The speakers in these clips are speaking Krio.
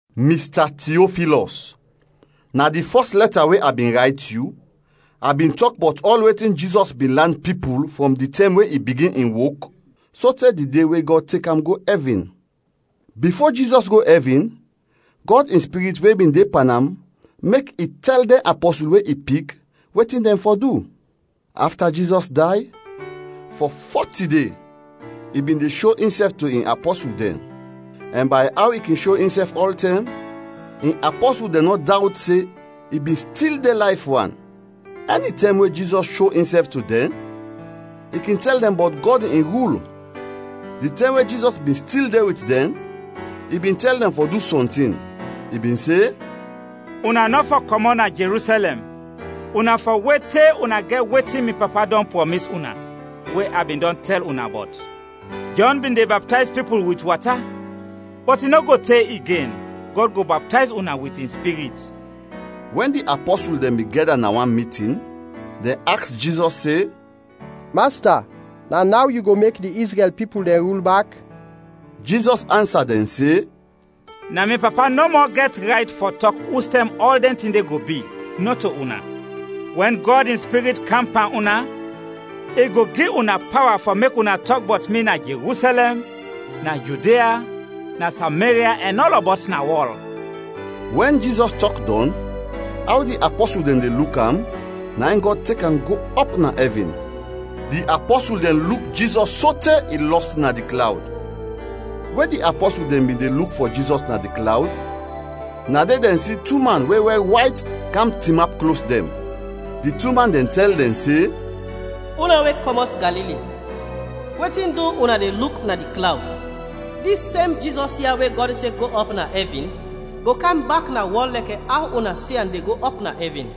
Mista Tiofilɔs, na di fɔs lɛta we a bin rayt yu, a bin tɔk bɔt ɔl wetin Jizɔs bin lan pipul frɔm di tɛm we i bigin in wok sote di de we Gɔd tek am go ɛvin. Bifo Jizɔs go ɛvin, Gɔd in Spirit we bin de pan am mek i tɛl dɛn apɔsul we i pik wetin dɛn fɔ du. Afta Jizɔs day, fɔ fɔti de i bin de sho insɛf to in apɔsul dɛn; ɛn bay aw i kin sho insɛf ɔltɛm, in apɔsul dɛn nɔ dawt se i bin stil de layf wan. Ɛnitɛm we Jizɔs sho insɛf to dɛn, i kin tɛl dɛn bɔt Gɔd in rul. Di tɛm we Jizɔs bin stil de wit dɛn, i bin tɛl dɛn fɔ du sɔntin; i bin se, “Una nɔ fɔ kɔmɔt na Jerusɛlɛm, una fɔ wet te una gɛt wetin mi Papa dɔn prɔmis una, we a bin dɔn tɛl una bɔt. Jɔn bin de baptayz pipul wit wata, bɔt i nɔ go te igen Gɔd go baptayz una wit in Spirit.” Wɛn di apɔsul dɛn bin gɛda na wan mitin, dɛn aks Jizɔs se, “Masta, na naw yu go mek di Izrɛl pipul dɛn rul bak?” Jizɔs ansa dɛn se, “Na mi Papa nɔmɔ gɛt rayt fɔ tɔk ustɛm ɔl dɛn tin de go bi, nɔto una. Wɛn Gɔd in Spirit kam pan una, i go gi una pawa fɔ mek una tɔk bɔt mi na Jerusɛlɛm, na Judia, na Sameria ɛn ɔlɔbɔt na wɔl.” Wɛn Jizɔs tɔk dɔn, aw di apɔsul dɛn de luk am, na in Gɔd tek am go ɔp na ɛvin. Di apɔsul dɛn luk Jizɔs sote i lɔs na di klawd. We di apɔsul dɛn bin de luk fɔ Jizɔs na di klawd, na de dɛn si tu man we wɛr wayt kam tinap klos dɛn. Di tu man dɛn tɛl dɛn se, “Una we kɔmɔt Galili, wetin du una de luk na di klawd? Dis sem Jizɔs ya we Gɔd tek go ɔp na ɛvin go kam bak na wɔl lɛkɛ aw una si am de go ɔp na ɛvin.”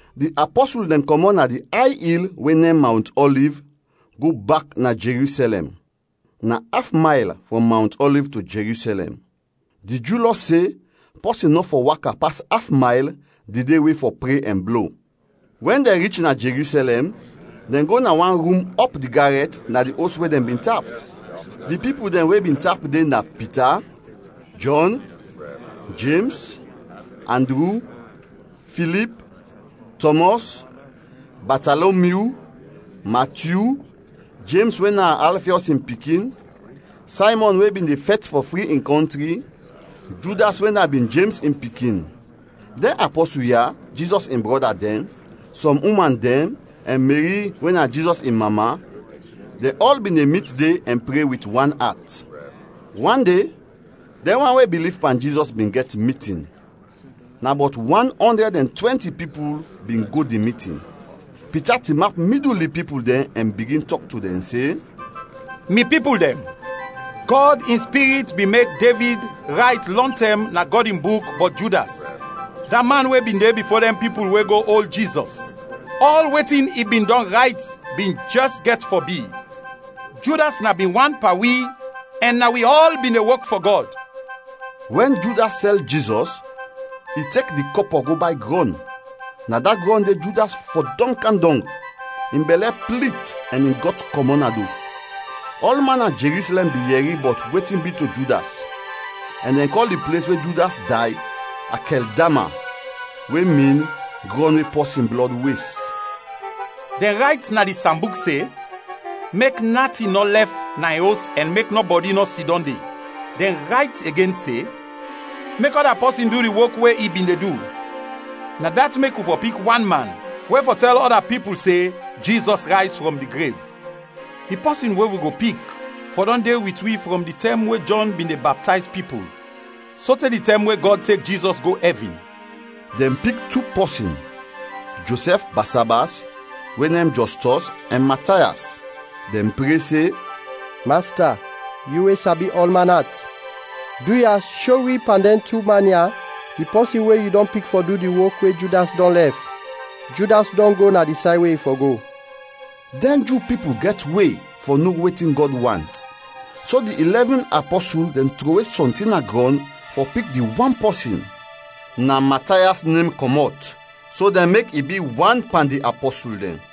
Di apɔsul dɛn kɔmɔt na di ay il we nem Mawnt Ɔliv, go bak na Jerusɛlɛm. (Na af mayl frɔm Mawnt Ɔliv to Jerusɛlɛm. Di Ju Lɔ se pɔsin nɔ fɔ waka pas af mayl di de we fɔ pre ɛn blo.) Wɛn dɛn rich na Jerusɛlɛm, dɛn go na wan rum ɔp di garɛt na di os we dɛn bin tap. Di pipul dɛn we bin tap de na Pita, Jɔn, Jems, Andru, Filip, Tɔmɔs, Batalomyu, Matyu, Jems we na Alfiɔs in pikin, Saymɔn we bin de fɛt fɔ fri in kɔntri, Judas we na bin Jems in pikin. Dɛn apɔsul ya, Jizɔs in brɔda dɛn, sɔm uman dɛn, ɛn Meri we na Jizɔs in mama, dɛn ɔl bin de mit de ɛn pre wit wan at. Wan de, dɛn wan we biliv pan Jizɔs bin gɛt mitin; na bɔt wan ɔndrɛd ɛn twɛnti pipul bin go di mitin. Pita tinap midul di pipul dɛn ɛn bigin tɔk to dɛn se, “Mi pipul dɛn, Gɔd in Spirit bin mek Devid rayt lɔntɛm na Gɔd in Buk bɔt Judas, da man we bin de bifo dɛn pipul we go ol Jizɔs; ɔl wetin i bin dɔn rayt bin jɛs gɛt fɔ bi. Judas na bin wan pan wi ɛn na wi ɔl bin de wok fɔ Gɔd.” (Wɛn Judas sɛl Jizɔs, i tek di kɔpɔ go bay grɔn. Na da grɔn de Judas fɔdɔm kam dɔng, in bɛlɛ plit ɛn in gɔt kɔmɔt na do. Ɔlman na Jerusɛlɛm bin yɛri bɔt wetin bi to Judas ɛn dɛn kɔl di ples we Judas day, Akɛldama, we min “Grɔn we Pɔsin Blɔd Wes”.) “Dɛn rayt na di Sambuk se, ‘Mek natin nɔ lɛf na in os ɛn mek nɔbɔdi nɔ sidɔm de.’ Dɛn rayt igen se, ‘Mek ɔda pɔsin du di wok we i bin de du.’ “Na dat mek wi fɔ pik wan man we fɔ tɛl ɔda pipul se Jizɔs rayz frɔm di grev. Di pɔsin we wi go pik fɔ dɔn de wit wi frɔm di tɛm we Jɔn bin de baptayz pipul sote di tɛm we Gɔd tek Jizɔs go ɛvin.” Dɛn pik tu pɔsin: Josɛf Basabas (we nem Jɔstɔs) ɛn Matayas. Dɛn pre se, “Masta, yu we sabi ɔlman at, duya, sho wi pan dɛn tu man ya, di pɔsin we yu dɔn pik fɔ du di wok we Judas dɔn lɛf. Judas dɔn go na di say we i fɔ go.” Dɛn Ju pipul gɛt we fɔ no wetin Gɔd want, so di ilɛvin apɔsul dɛn trowe sɔntin na grɔn fɔ pik di wan pɔsin. Na Matayas nem kɔmɔt so dɛn mek i bi wan pan di apɔsul dɛn.